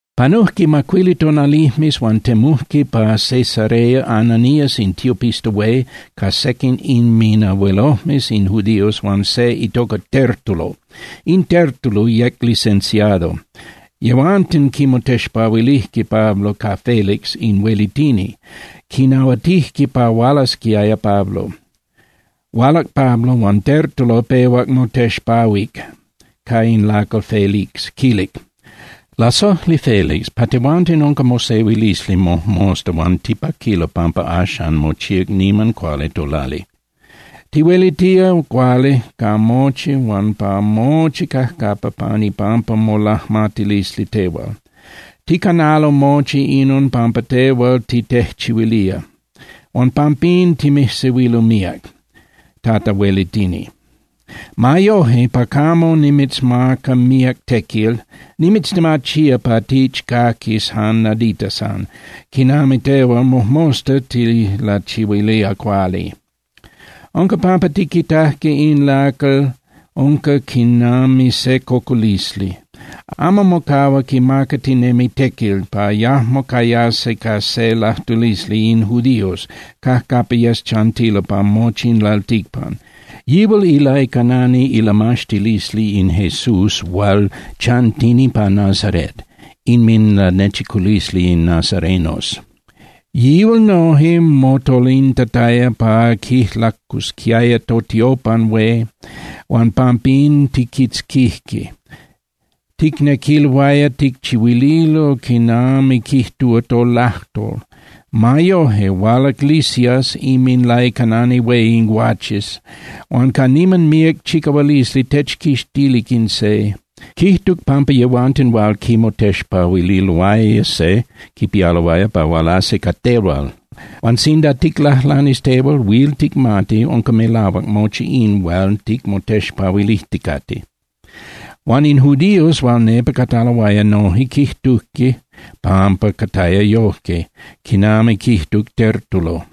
Panujque macuili tonalijmes, huan temujque pa Cesarea Ananías in tiopista hué ca sequin inminabuelojmes in judíos huan se itoca Tértulo. In Tértulo yec licenciado. Yehuanten quimotexpahuilijque Pablo ca Felix in huelitini. Quinahuatijque pa hualasquiaya Pablo. Hualac Pablo, huan Tértulo pehuac motexpahuic ca in lacal Felix, quilic: —Lasojli Félix, pa tehuanten unca mosehuilisli mojmosta huan tipaquilo pampa axan mochíac niman cuali tolali. Tihuelitía cuali ca mochi huan pa mochi cajcapa pan ipampa molajmatilisli tehual. Ticanalo mochi inon pampa tehual titejchihuilía. Huan pampín timijsehuilo míac, Tata Huelitini. Ma yoje, pa camo nimitzmaca míac tequil, nimitztemachía pa tichcaquis jan nadita san, quinami tehual mojmosta tilachihuilía cuali. Unca pampa tiquitajque in lacal unca quinami se cocolisli. Amo mocahua quimacatinemi tequil pa yajmo cayasi ca se lajtulisli in judíos cajcapa yes chantilo pa mochi in lalticpan. Yihual ilaicanani ilamaxtilisli in Jesús hual chantini pa Nazarét, inminlanechiculisli in nazarenos. Yihual noje motolintataya pa quijlacusquiaya totiopan hué huan pampín tijquitzquijque. Ticnequiloaya ticchihuililo quinami quijtúa tolajtol. Ma yoje, hualac Lisias inminlaicanani hué in guaches huan ca niman míac chicahualisli techquixtilic in se. Quijtuc pampa yehuanten hual quimotexpahuililoaya se quipialoaya pa hualasi ca tehual. Huan sinda ticlajlanis tehual, huil ticmati unca melahuac mochi in hual ticmotexpahuilijticate. Huan in judíos hual nepa cataloaya noje quijtujque pampa cataya yojque quinami quijtuc Tértulo.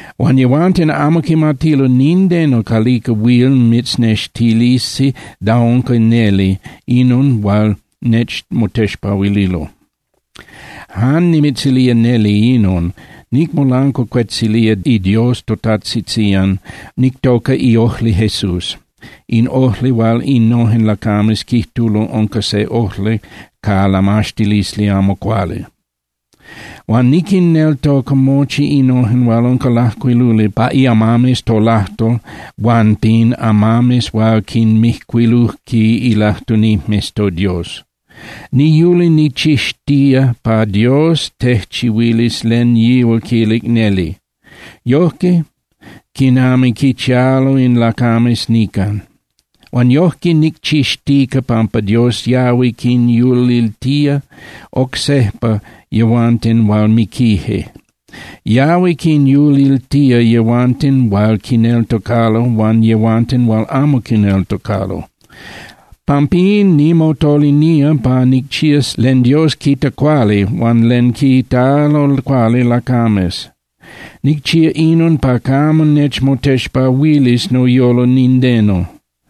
Huan yehuanten amo quimatilo nindeno calica huil mitznextilisi da unca neli inon hual nechmotexpahuililo. Jan nimitzilía neli inon, nicmolancuacuetzilía iDios totajtzitzían, nictoca iojli Jesús, in ojli hual innojen lacames quijtulo unca se ojli ca lamaxtilisli amo cuali. Huan niquinneltoca mochi innojen hual unca lajcuiluli pa iamames tolajtol huan pin amames hual quinmijcuilujque ilajtunijmes toDios. Niyuli nicchixtía pa Dios tejchihuilis len yihual quilic neli, yojque quinami quichialo in lacames nican. Huan yojque nicchixtica pampa Dios yahui quinyuliltía oc sejpa yehuanten hual miquije. Yahui quinyuliltía yehuanten hual quineltocalo huan yehuanten hual amo quineltocalo. Pampín nimotolinía pa nicchías len Dios quita cuali huan len quitalo cuali lacames. Nicchía inon pa camo nechmotexpahuilis noyolo nindeno.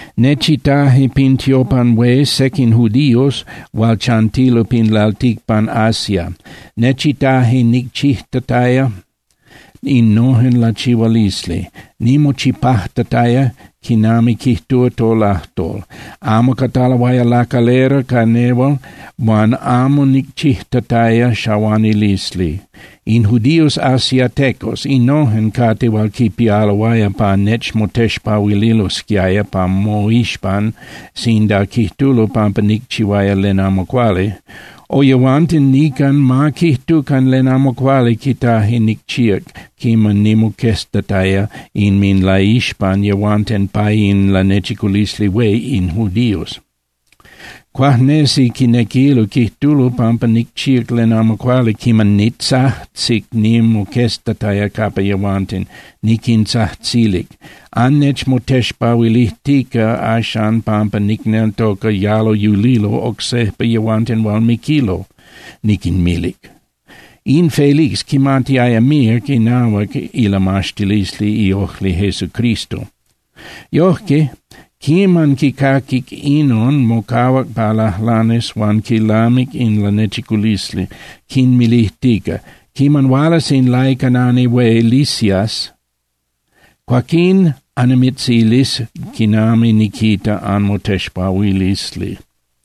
Nechitaje pin tiopan hué sequin judíos hual chantilo pin lalticpan Asia. Nechitaje nicchijtataya innojen lachihualisli, nimochipajtataya quinami quijtúa tolajtol. Amo cataloaya lacalera ca nehual huan amo nicchijtataya xahuanilisli. In judíos asiatecos, innojen cate hual quipialoaya pa nechmotexpahuililosquiaya pa moixpan sinda quijtulo pampa nicchihuaya len amo cuali. O yehuanten nican ma quijtucan len amo cuali quitaje nicchíac quiman nimoqueztataya inminlaixpan yehuanten pa inLanechiculisli Hué in judíos. Cuajnesi quinequilo quijtulo pampa nicchíac len amo cuali quiman nitzajtzic nimoqueztataya capa yehuanten, niquintzajtzilic: “Annechmotexpahuilijtica axan pampa nicneltoca yalo yulilo oc sejpa yehuanten hual miquilo”, niquinmilic. In Félix quimatiaya míac inahuac ilamaxtilisli iojli Jesucristo. Yojque, quiman quicaquic inon, mocahuac pa lajlanis huan quilamic in lanechiculisli, quinmilijtica: —Quiman hualas in laicanani hué Lisias, cuaquín annimitzilis quinami niquita anmotexpahuilisli.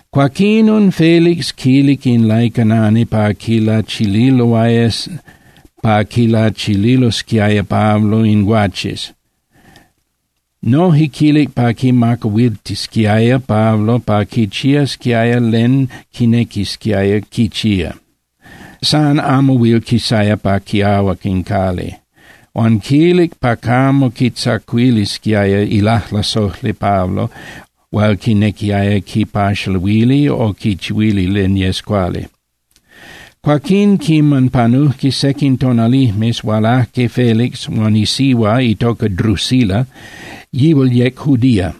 Cuaquinon Félix quilic in laicanani pa quilachililosquiaya Pablo in guaches. Noje quilic pa quimacahuiltisquiaya Pablo pa quichiasquiaya len quinequisquiaya quichía, san amo huil quisaya pa quiahuac in cali. Huan quilic pa camo quitzacuilisquiaya ilajlasojli Pablo hual quinequiaya quipaxaluili o quichihuili len yes cuali. Cuaquín, quiman panujque sequin tonalijmes, hualajque Félix huan isihua itoca Drusila, yihual yec judía.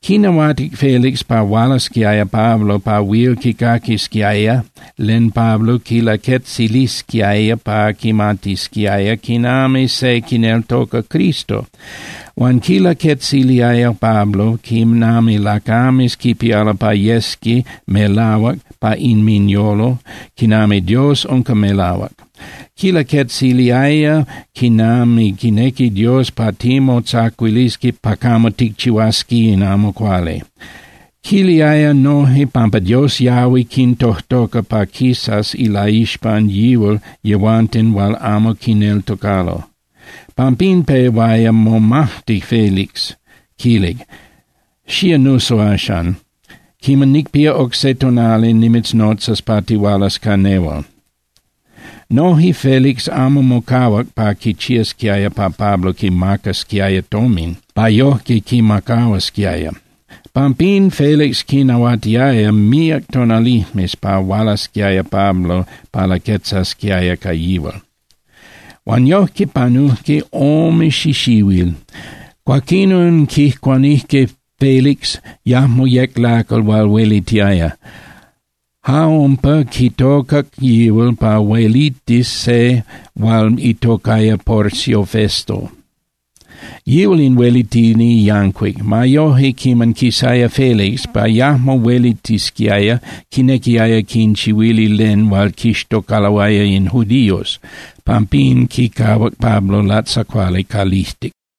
Quinahuatic Félix pa hualasquiaya Pablo pa huil quicaquisquiaya len Pablo quilaquetzilisquiaya pa quimatisquiaya quinami se quineltoca Cristo. Huan quilaquetziliaya Pablo quinami lacames quipialo pa yesqui melahuac pa inminyolo quinami Dios unca melahuac. Quilaquetziliaya quinami quinequi Dios pa timotzacuilisqui pa camo ticchihuasqui in amo cuali. Quiliaya noje pampa Dios yahui quintojtoca pa quisas ilaixpan yihual yehuanten hual amo quineltocalo. Pampín pehuaya momajti Félix, quilic: —Xía nuso axan. Quiman nicpía oc se tonali nimitznotzas pa tihualas ca nehual. Noje Félix amo mocahuac pa quichiasquiaya pa Pablo quimacasquiaya tomin pa yojque quimacahuasquiaya. Pampín Félix quinahuatiaya míac tonalijmes pa hualasquiaya Pablo pa laquetzasquiaya ca yihual. Huan yojque panujque ome xixihuil. Cuaquinon quijcuanijque Félix, yajmo yec lacal hual huelitiaya. Ja umpa quitocac yihual pa huelitis se hual itocaya Porcio Festo. Yihual in huelitini yancuic. Ma yoje, quiman quisaya Félix pa yajmo huelitisquiaya, quinequiaya quinchihuili len hual quixtocaloaya in judíos. Pampín quicahuac Pablo latzacuali calijtic.